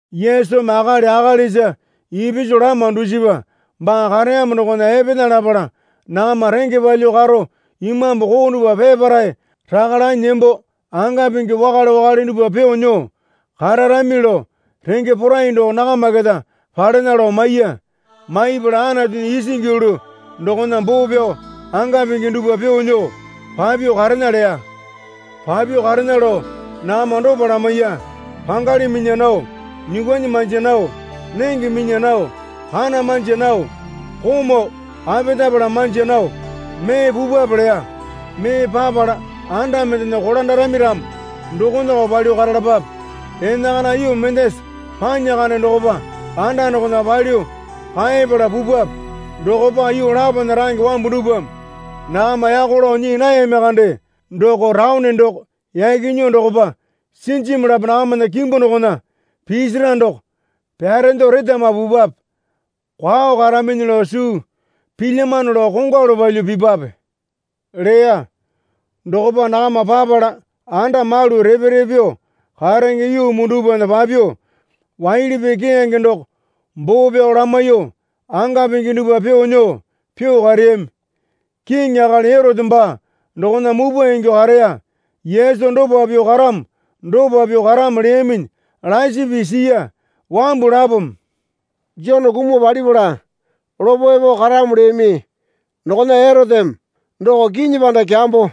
Yesumi akali akalisa ipisu lama dusipa baa kareyamo dokona epena lapala nakama renge palyuo karo imambu koo dupwa peparae raka lanyi nembo anga pingi wakale wakale dupwa pyuo nyuo kararami lao renge porai doko nakama keta palena lao maiya. Maipala Anatunya isingi yulu dokona boo pyao, anga pingi dupwa pyuo nyuo papyuo karena leya. Papyuo karena lao nakama dopa lamaiya. Pangali minya nao, nyuukwuanyi manja nao, nenge minya nao, kana manja nao, komau apetapala manja nao mee pupwape, leya. Mee papala anda mendena kolandarami ramo dokonako palyuo karalapape. Enakana yuu mendasa panya kande dokopa anda dokonako palyuo kaepala pupwape. Dokopa yuu lapona range wambu dupwame nakama yako lao nyii nayami kande doko taone doko yaki nyuo dokopa sinjimu lapo nakamana kimbu dokona pisira doko pyarendo retama pupwape. Kwao karaminyi lao suu pilyamano lao kongwalu palyuo pipwape, leya. Dokopa nakama papala anda malu repe repe pyuo karenge yuu muu dupwana papyuo, waili pii keyange doko boo pyao lamaiyuo, anga pingi dupwa pyuo nyuo pyuo kareyami. Kiŋi akali Erote baa dokona mupwa ingyuo kareya Yesu dopa pyuo karamo dopa pyuo karamo leyaminyi lasi pii siya. Wambu lapome, Jone kumuo palipala lopo epo karamo leyami dokona Eroteme doko kinyi panda kyambo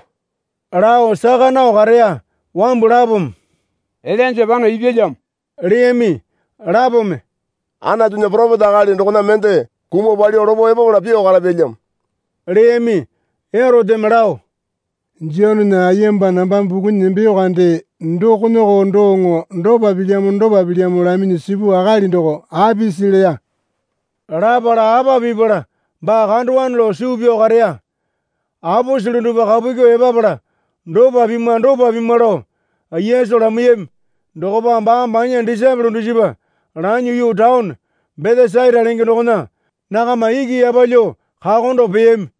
lao saka nao kareya. Wambu lapome, Ilainja pano ipyalyamo leyami. Lapome, Anatunya poropeta akali dokona mende kumuo palyuo lopo epapala pyuo karapyalyamo, leyami. Eroteme lao, Jonena ayemba nambame pukunyi nembeyo kande dokonako doŋo dopa pilyamo dopa pilyamo laminyi sipu akali doko apisi? leya. Lapala apa pipala baa kandowane lao suu pyao kareya. Aposele dupwa kapu kyuo epapala dopa pimwa dopa pimwa lao Yesu lamaiyami. Dokopa baame banya disaepole dusipa lanyuo yuu taone Betesaita lenge dokona nakama iki yapalyuo kakondo peyami.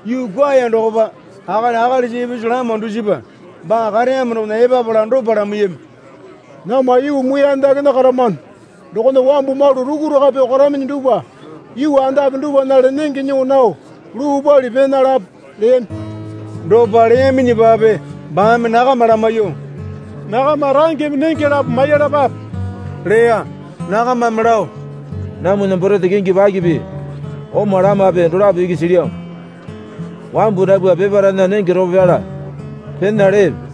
Yuu kwuaya dokopa akali akalisa ipisu lama dusipa baa kareyamo dokona epapala dopa lamaiyami. Namwa yuu muiyane dakena karamano dokona wambu malu rukuraka pyuo karaminyi dupwa yuu andape dupwanale nenge nyuo nao luu pali pena lape, leyami. Dopa leyaminyipape baame nakama lamaiyuo, Nakama rangeme nenge lapo maiyalapape, leya. Nakamame lao, Namwana borete kingi pakipi oma lamape dolapo iki silyamo. Wambu dapwa peparaena nenge ropo pyala pena lepe.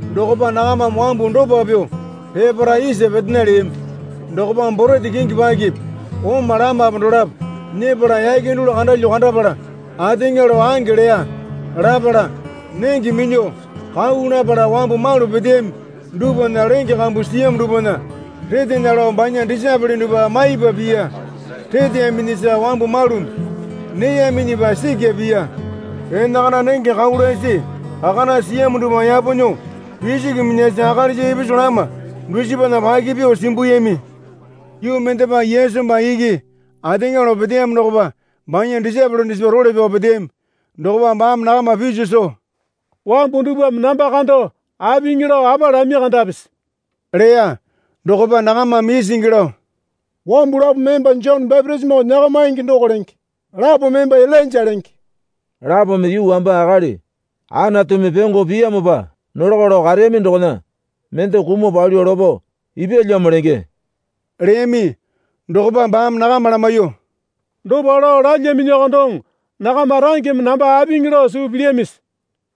Dokopa nakamame wambu dopa pyuo peparae isa petena leyami. Dokopa borete kingi pakipi oma lamape dolapo nyepala yake dulu kandalyo kandapala ateŋa lao ange leya. Lapala nenge minyuo kau lapala wambu malu peteyami dupwana lenge kambu siyamo dupwana retena lao banya disaepole dupwa maipa piya. Reteyaminyisa wambu malumi neyaminyipa sikya piya. Enakana nenge kau lasi kakana siyamo dupwa yapo nyuo pisiki minyasi akalisa ipisu lama dusipana paki pyuo simbuyami. Yuu mendepa Yesu baa iki ateŋa lao peteyamo dokopa banya disaepole dusipa role pyao peteyami. Dokopa baame nakama piso soo, Wambu dupwame namba kando apiŋi lao apa lami kandapisi? leya. Dokopa nakamame isingi lao, Wambu lapome emba Jone bapitisimo nyakamaingi doko lenge. Lapome emba Ilainja lenge, lapome yuu wamba akali Anatumi pyongo piyamopa nolako lao kareyami dokona mende kumuo palyuo lopo ipyalyamo lenge, leyami. Dokopa baame nakama lamaiyuo, Dopa lao lalyaminyiko doŋo nakama rangeme namba apiŋi lao suu pilyamisi?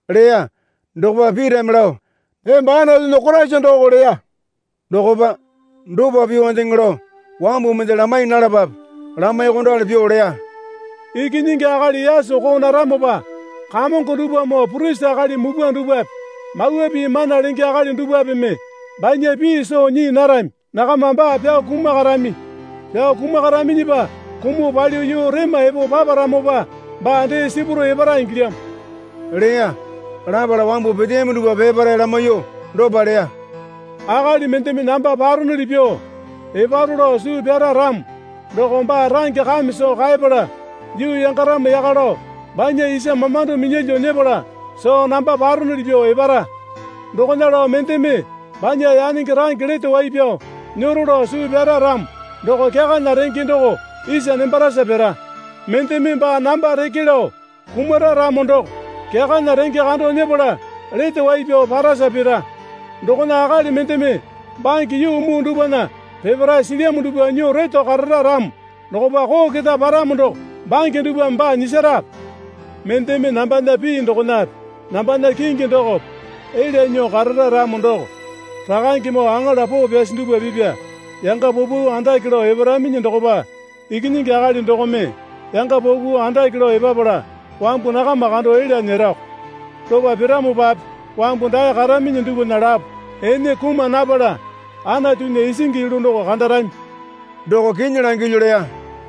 leya. Dokopa Pitame lao, Emba Anatunya Koraisa doko leya. Dokopa, dopa pyuondeŋe lao wambu mende lamai nalapape, lamaiyuokondali pyuo leya. Ikinyingi Akali yaso koo naramopa Kamongo dupwamoo purisi akali mupwa dupwape Mawa Pii mana lenge akali dupwapeme banya pii soo nyii narami. Nakama baa pyao kumakarami. Pyao kumakaraminyipa kumuo palyuo yuu rema epo paparamopa baa dee sipuro epara ingilyamo, leya. Lapala wambu peteyami dupwa peparae lamaiyuo dopa leya. Akali mendeme namba paronoli pyuo eparo lao suu pyara ramo doko baa range kame soo kaepala yuu yangaramo yaka lao banya isa mamando minyalyuo nyepala soo namba paronuli pyuo epara. Dokona lao mendeme banya yanenge range lete wai pyao nyero lao suu pyara ramo doko kyakana renge doko isa nembarasa pira. Mendeme baa namba reke lao kumara ramo doko kyakana renge kando nyepala lete wai pyao parasa pira. Dokona akali mendeme bange yuu muu dupwana peparae silyamo dupwa nyuo reto karara ramo dokopa koo keta paramo doko bange dupwame baa nyisarape? Mendeme nambana pii dokonape nambana kingi dokope elya nyuo karara ramo doko, Rakangemoo aŋala poo pyasi dupwa pipya yanga paupau andake lao eparaminyi dokopa Ikinyingi Akali dokome yanga paupau andake lao epapala wambu nakama kando elya nyerako. Dopa piramopape wambu dae karaminyi dupwana lapo ene kuma napala Anatunya isingi yulu doko kandarami, doko kinyi langilyu leya.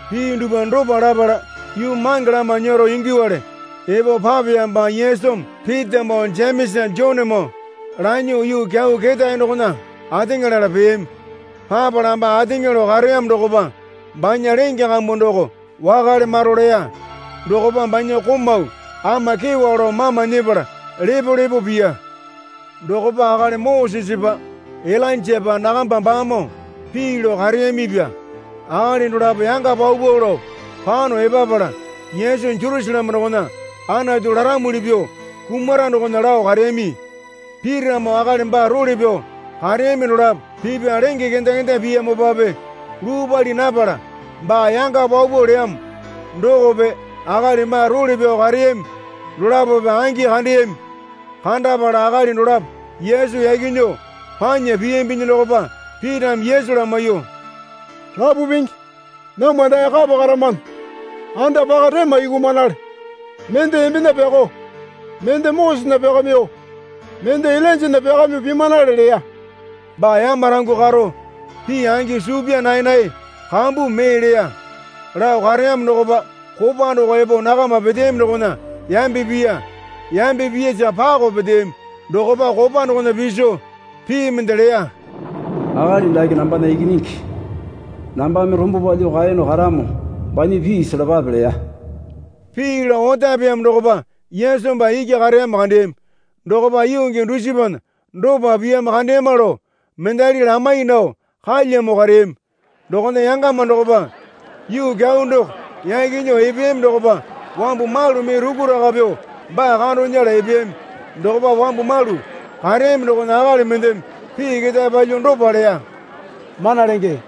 Pii dupwa dopa lapala yuu mange lama nyero ingyuowale epo papeyamopa Yesumi Pitamoo Jemesa Jonemoo lanyuo yuu kyau ketae dokona ateŋa lala peyami. Papala baa ateŋa lao kareyamo dokopa banya lenge kambu doko wakale maro leya. Dokopa banya komau ama kyewa lao mama nyepala lepo lepo piya. Dokopa akali Mosesepa Ilainjapa nakamba baamoo pii lao kareyamipya. Akali dolapo yanga paupau lao pano epapala Yesu Jerusaleme dokona Anatu laramuli pyuo kumara dokona lao kareyami. Pitamoo akali baa role pyao kareyami dolapo pipya lenge kenda kenda piyamopape luu pali napala baa yanga paupau leyamo dokope akali baa role pyao kareyami dolapope angi kandeyami. Kandapala akali dolapo Yesu yaki nyuo panya piyambinyi dokopa Pitame Yesu lamaiyuo, Rapu Pingi, namwa dae kapa karamano. Anda paka rema yukumanale. Mende embena pyakao, mende Mosesena pyakamyuo, mende Ilainjana pyakamyuo pimanale leya. (Baa yamarangyuo karo pii angi suu pyaa naenae kambumi mee leya.) Lao kareyamo dokopa kopa doko epo nakama peteyami dokona yambe piya. Yambe piyasa pakao peteyami. Dokopa kopa dokona piso pii mende leya. Akali dake nambana Ikinyingi nambame rombo palyuo kaeyono karamo banya pii selapape leya. Pii lao otapeyamo dokopa Yesu baa iki kareyamo kandeyami. Dokopa yuu gii dusipana dopa piyamo kandeyama lao mendali lamai nao kalyamo kareyami. Dokona yangama dokopa yuu kyau doko yaki nyuo epeyami dokopa wambu malu mee rukuraka pyuo baa kando nyela epeyami. Dokopa wambu malu kareyami dokona akali mendeme pii ketae palyuo dopa leya. Mana Lenge,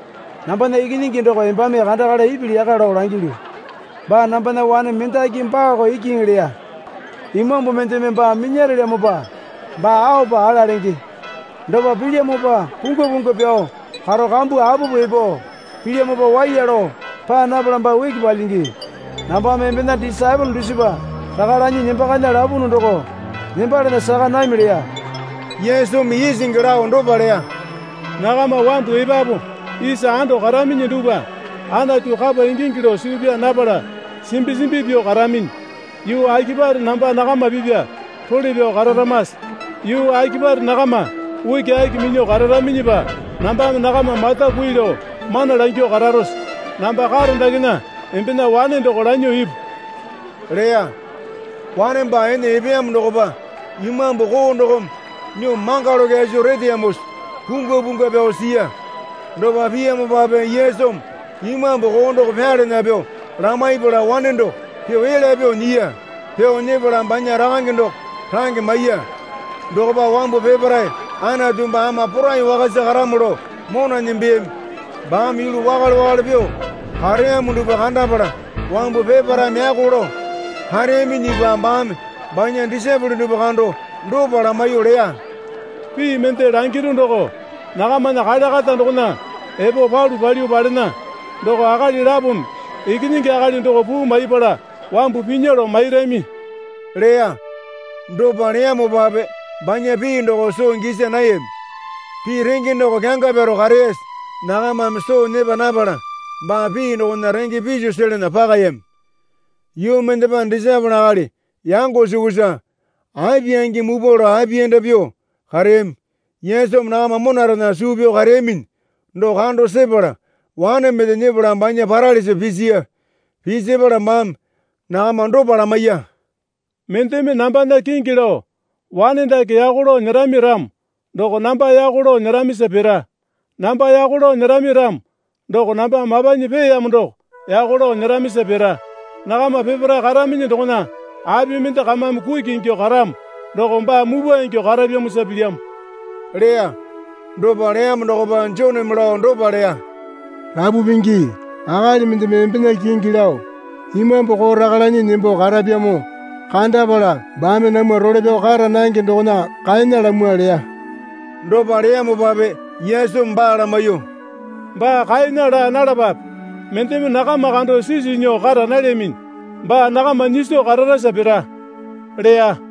nambana ikinyingi doko embame kandakala ipili yaka lao langilyu. Baa nambana wane mendaki baako ikiŋi leya. Imambu mendeme baa minyarelyamopa baa aopa ala lenge. Dopa pilyamopa pungwa pungwa pyao karo kambu apupu epo pilyamopa waiya lao paa napala baa uki palyingi. Nambame embena disaepole dusipa raka lanyi nembakana lapunu doko nembalana saka nami leya. Yesumi isingi lao dopa leya. Nakama wambu epapu isa anda karaminyi dupwa, Anatu kapa ingingi lao suu pyaa napala simbi simbi pyuo karaminyi. Yuu akipare namba nakama pipya role pyao kararamase? Yuu akipare nakama ukiaki minyuo kararaminyipa nambame nakama mata kui lao mana langyuo kararose? Namba karo dakena embena wane doko lanyuo ipu, leya. Wane baa ene epeyamo dokopa imambu koo dokome nyuo mangalo kyaso reteyamosa pungwa pungwa pyao siya. Dopa piyamopape Yesumi imambu koo doko pyalana pyuo lamaipala wane doko pyuo elya pyuo nyiya. Pyuo nyepala banya rakange doko range maiya. Dokopa wambu peparae, Anatu baa ama porai wakasa karamo, lao mona nembeyami. Baame yulu wakale wakale pyuo kareyamo dupwa kandapala wambu peparaeme yako lao kareyaminyipa baame banya disaepole dupwa kando dopa lamaiyuo leya. Pii mende langiru doko nakamana kale kata dokona epo palu palyuo palena. Doko akali lapome Ikinyingi Akali doko puu maiyapala wambu pinya lao mairami, leya. Dopa leyamopape banya pii doko soo gisa nayami. Pii renge doko kyanga pyaro kareyasa nakamame soo nyepa napala baa pii dokona renge piso selana pakayami. Yuu mendepa disaepole akali yango sukusa api angi mupwa lao apiyanda pyuo kareyami. Yesumi nakama monarena suu pyao kareyaminyi doko kando sepala wane mende nyepala banya paralisa pisiya. Pisapala baame nakama dopa lamaiya. Mendeme nambana kingi lao wane dake yako lao nyerami ramo doko namba yako lao nyeramisa pira. Namba yako lao nyerami ramo doko namba mapanyi peeyamo doko yako lao nyeramisa pira. Nakama peparae karaminyi dokona api mende kamame kuki ingyuo karamo doko baa mupwa ingyuo karapyamosa pilyamo, leya. Dopa leyamo dokopa Joneme lao dopa leya. Rapu Pingi, akali mendeme embena kingi lao imambu koo raka lanyi nembo karapyamo kandapala baame namwa role pyao kara nange dokona kaena lamwa, leya. Dopa leyamopape Yesumi baa lamaiyuo, Baa kaena laa nalapape. Mendeme nakama kando sisu nyuo kara nalyaminyi baa nakama nyiso kararasa pira leya.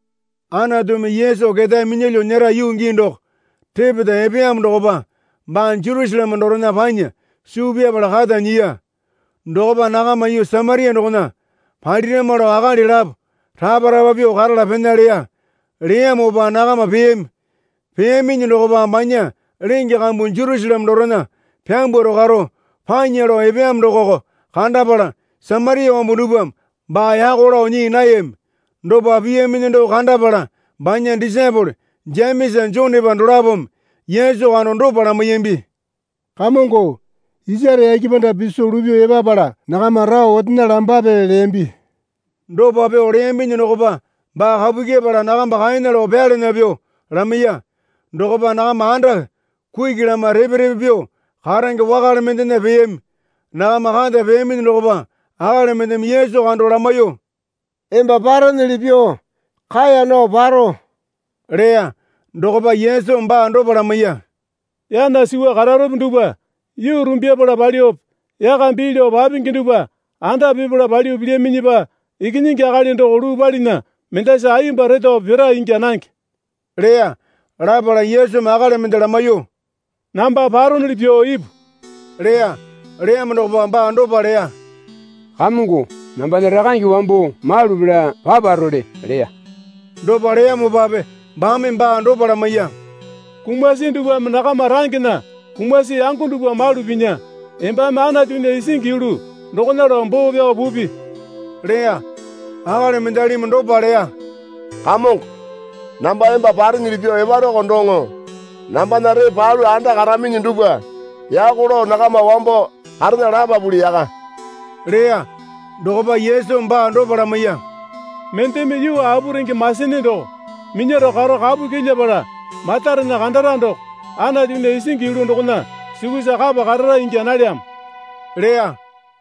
Anatumi Yesu ketae minyalyuo nyera yuu gii doko repeta epeyamo dokopa baa Jerusaleme dorena panya suu pyapala kata nyiya. Dokopa nakama yuu Samaria dokona palirama lao akali lapo rapa rapa pyuo karala pena leya. Leyamopa nakama peyami. Peyaminyi dokopa banya lenge kambu Jerusaleme dorena pambwaro karo panya lao epeyamo dokoko kandapala Samaria wambu dupwame baa yako lao nyii nayami. Dopa piyaminyi doko kandapala banya disaepole Jemesa Jonepa dolapome Yesu kando dopa lamaiyambi. Kamongo, isare yake panda piso lupyuo epapala nakama rao otena lambape, leyambi. Dopa pyuo leyambinyi dokopa baa kapu kyepala nakamba kaena lao pyalana pyuo lamaiya. Dokopa nakama anda kuki lama repe repe pyuo karenge wakale mendena peyami. Nakama kata peyaminyi dokopa akali mendeme Yesu kando lamaiyuo, Emba parenyili pyuo kaeya nao paro, leya. Dokopa Yesumi baa dopa lamaiya. Yana suwa kararope dupwa yuu rumbyapala palyuope yaka bii lao papingi dupwa anda pipala palyuo pilyaminyipa Ikinyingi Akali doko luu palinya mendasa ayemba retowape pira ingya nange leya. Lapala Yesumi akali mende lamaiyuo, Namba paronuli pyuo ipu leya. Leyamo dokopa baa dopa leya. Kamongo, nambana rakange wambo malu pela paparole leya. Dopa leyamopape baame baa dopa lamaiya. Kumasi dupwame nakama rangena kumasi yango dupwa malu pinya. Embame Anatunya isingi yulu dokona lao boo pyao pupi, leya. Akali mendalimi dopa leya. Kamongo, namba emba parenyili pyuo eparoko doŋo nambana ree palu anda karaminyi dupwa yako lao nakama wambo karena lapapuli yaka leya. Dokopa Yesumi baa dopa lamaiya. Mendeme yuu apu renge masene doko minyaro karo kapu kyilyapala matarena kandara doko Anatunya isingi yulu dokona sukusa kapa karara ingya nalyamo leya.